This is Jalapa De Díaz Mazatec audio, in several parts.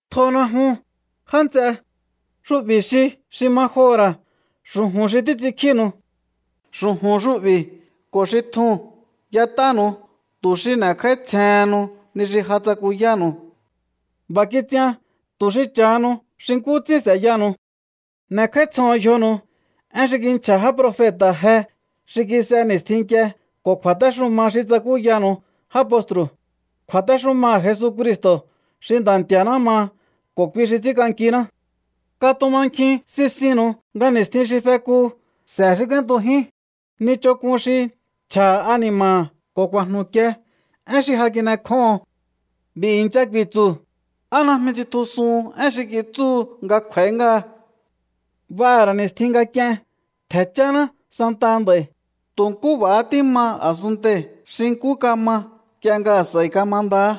Tjona jun, já nts'e. Xu'bi̱ xi xi ma joho̱ ra̱ xu̱ju̱n xi títs'inkjínu̱u. Xu̱ju̱n xu'bi̱ ko̱ xi tjuu̱n y'et'ánu̱u tu̱ xi n'e̱kj'áítsjehennu ni xi ja tsakuyánu̱u. B'a̱ kits'ian tu̱ xi cha̱hanu xi nkú ts'ín s'e̱yaha̱nu̱u. N'e̱kj'áítsjoho̱on yjonu̱u én xi kinchja̱ já profeta̱ je xi kis'e ni̱stjin nk'ie ko̱ kju̱a̱téxuma xi tsakúyanu̱u já postru̱, kju̱a̱téxumaha̱ Jesucristo̱ xi Nda̱ Nti̱a̱ná maha ko̱ kui xi ts'ínk'ankiná. Katumankjin sisinnu̱u nga ni̱stjin xi fekuu̱ s'e̱ xi k'úéntujín ni ch'onk'un xi nchja̱ha̱ ani̱ma̱ha̱ ko̱ ku̱a̱jnu̱kie én xi ja kin'ekjóho̱on. B'i̱ i̱ncha ku̱i̱tsu̱: “¿Á najmi tsitjusuhun én xi kitsúhu nga kj'u̱a̱í ngáha? B'aha̱ ra̱ ni̱stjin nga k'ien ntje̱ cháná santaha nd'a̱i̱, tu̱ nkú b'a̱há tíma a̱sunntei̱ xi nkú kama nk'ie nga a̱s'a̱i kamandahá.”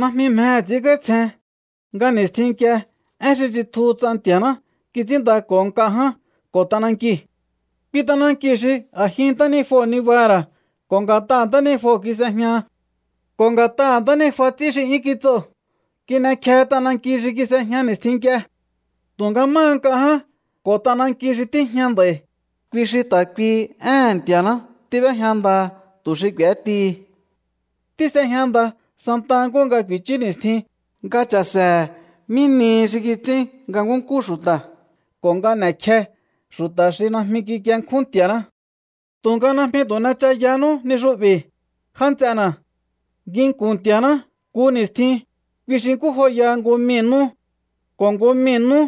Najmi mjehe̱ ts'i̱ínkj'áítsjen nga ni̱stjin nk'ie én xi tsitjuhu ts'a Nti̱a̱ná kits'ínndako̱ho nk'a ján ko̱ t'anankiu̱. Kui t'anankiu̱ xi a̱jin ntánijuo̱ nibaha̱ha̱ ra̱ ko̱ nga̱t'aha̱ ntánijuo̱ kis'ejñaha. Ko̱ nga̱t'aha̱ ntánijuaha̱ ts'í xi 'yún kits'oo̱ kin'ekjehe t'ananki xi kis'ejña ni̱stjin nk'ie. Tu̱nga máha nk'a ján ko̱ t'ananki xi tíjña nd'a̱i̱, kui xi ta̱ kuihi éhe̱n Nti̱a̱ná tíb'ejña ndaha̱ tu̱ xi k'u̱étihi. Tís'ejña nda santa nkúhu nga ku̱i̱chú ni̱stjin nga cha̱se̱he̱ mí nihi xi kits'ín nga nkúnkú xu̱ta̱ ko̱ nga n'e̱kje xu̱ta̱ xi najmi kikienkjún Nti̱a̱ná. Tu̱nga najmi tu̱ n'echayanú ni xu'bi̱, já nts'ena̱. Nginku̱n Nti̱a̱ná nku ni̱stjin, kui xi nkú joyaha nku mii̱ nú. Ko̱ nku mii̱ nú,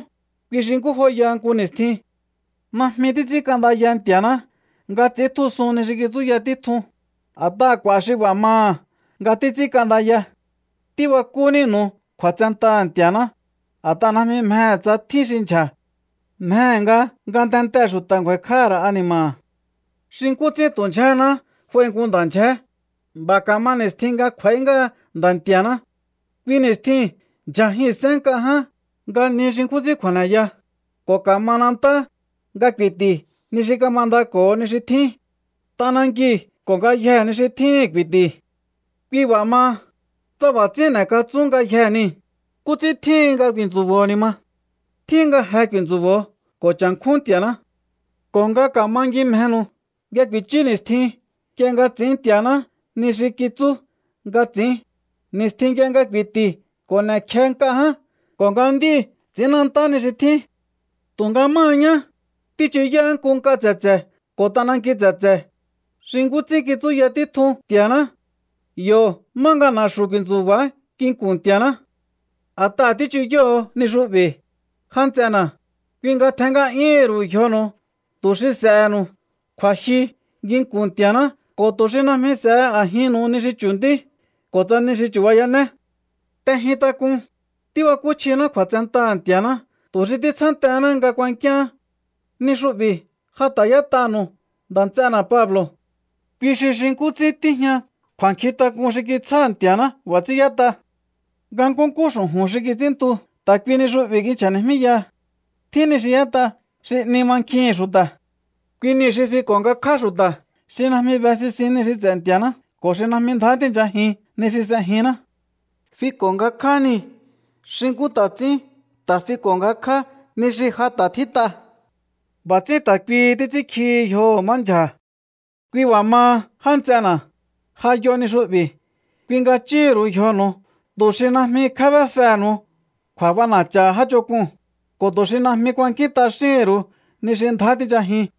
kui xi nkú joyaha nku ni̱stjin. Najmi títs'ínk'andaya Nti̱a̱ná nga ts'i̱íntjusun ni xi kitsúya títjun, a̱t'aha̱ k'u̱a̱ xi b'a̱ maha nga títs'ínk'andaya. Tíbakú nínu̱u kju̱a̱tsentaha̱ Nti̱a̱ná, a̱t'aha̱ najmi mjehe̱ tsa tjín xi ndyja̱. Mjehe̱ nga ngatentee̱ xu̱ta̱ ngju̱a̱i̱kj'áha̱ ra̱ ani̱ma̱ha̱. Xi nkú ts'ín tu̱ ndyjaháná nga f'ai nku nda̱ ndyjé, b'a̱ ka̱ma ni̱stjin nga kj'u̱a̱í ngáha Nda̱ Nti̱a̱ná. Kui ni̱stjiu̱n ndyja̱jihi̱nsén nk'a ján nga ni xi nkjún ts'ín kju̱a̱neya, ko̱ ka̱manantá nga ku̱i̱ti̱ ni xi kamandako̱ho ni xi tjín. T'anankiu̱ ko̱ ngayjee̱ ni xi tjíhi̱n ku̱i̱ti̱. Kui b'a̱ maha, tsa b'a̱ ts'ín n'e̱katsún ngayjee̱ niu̱, ¿nkú ts'ín tjíhin nga ku̱i̱tsu̱bo̱o ni̱ ma? Tjíhin nga je ku̱i̱ntsu̱bo̱o ko̱ cha̱nkjún Nti̱a̱ná ko̱ nga ka̱mangimjenu̱u nga ku̱i̱chú ni̱stjin nk'ie nga ts'i̱ín Nti̱a̱ná ni xi kitsú nga ts'i̱ín, ni̱stjin nk'ie nga ku̱i̱ti̱ ko̱ n'e̱kje nk'a ján ko̱ nga nd'íu̱ ts'i̱ínnantá ni xi tjín. Tu̱nga máha ñá, tíchuyáá nku nk'a tse̱tse̱ ko̱ t'ananki tse̱tse̱, xi nkú ts'ín kitsúya títjun Nti̱a̱ná. Yo̱hó má nga na̱xu̱ ku̱i̱ntsu̱ba̱á nginku̱n Nti̱a̱ná. A̱t'aha̱ tíchuyóho̱o ni xu'bi̱, jántsena̱, kui nga tjen nga'yúhu̱n ru̱u yjonu̱u tu̱ xi s'e̱he̱nu̱u kju̱a̱jyu nginku̱n Nti̱a̱ná ko̱ tu̱ xi najmi s'e̱he a̱jinnu̱u ni xi chu̱ntí ko̱ tsa ni xi chu̱bayané. T'ejintak'un, tíbakúchjiná kju̱a̱tsentaha̱ Nti̱a̱ná tu̱ xi títsjántehená nga k'u̱a̱nkiá. Ni xu'bi̱ ja ta̱ y'ét'anu̱u nda̱ nts'ena̱ Pablo̱. Kui xi xi nkú ts'ín tíjña kju̱a̱nkjintak'un xi kitsjáha̱ Nti̱a̱ná, b'a̱ ts'ín yét'a. Nga nkúnkú xu̱ju̱n xi kits'ínntu ta̱ kui ni xu'bi̱ kinchja̱ni̱jmíyaha. Tjín ni xi y'ét'a xi 'ni mankjihi̱n xu̱ta̱. Kui niu̱ xi fiko̱ ngakjá xu̱ta̱ xi najmi be sisin ni xi ts'e̱ Nti̱a̱ná ko̱ xi najmi ndjá tíi̱nchajin ni xi s'ejinná. Fiko̱ ngakjá niu̱ xi nkú ta̱ ts'ín ta̱ fiko̱ngakjá ni xi ja ta̱ tjít'a. B'a̱ ts'ín ta̱ kuihi títs'ínkjihi yjoho̱ má ndyja̱. Kui b'a̱ maha, já nts'ena̱, ja yo ni xu'bi̱. Kui nga chúhu̱n ru̱u yjonu̱u tu̱ xi najmi kjébéfehe̱nu̱u kju̱a̱b'ana̱cha̱ha̱ já ch'onk'uu̱n, ko̱ tu̱ xi najmi kuankín t'axíhi̱n ru̱u ni xi ndjá tinchajiun.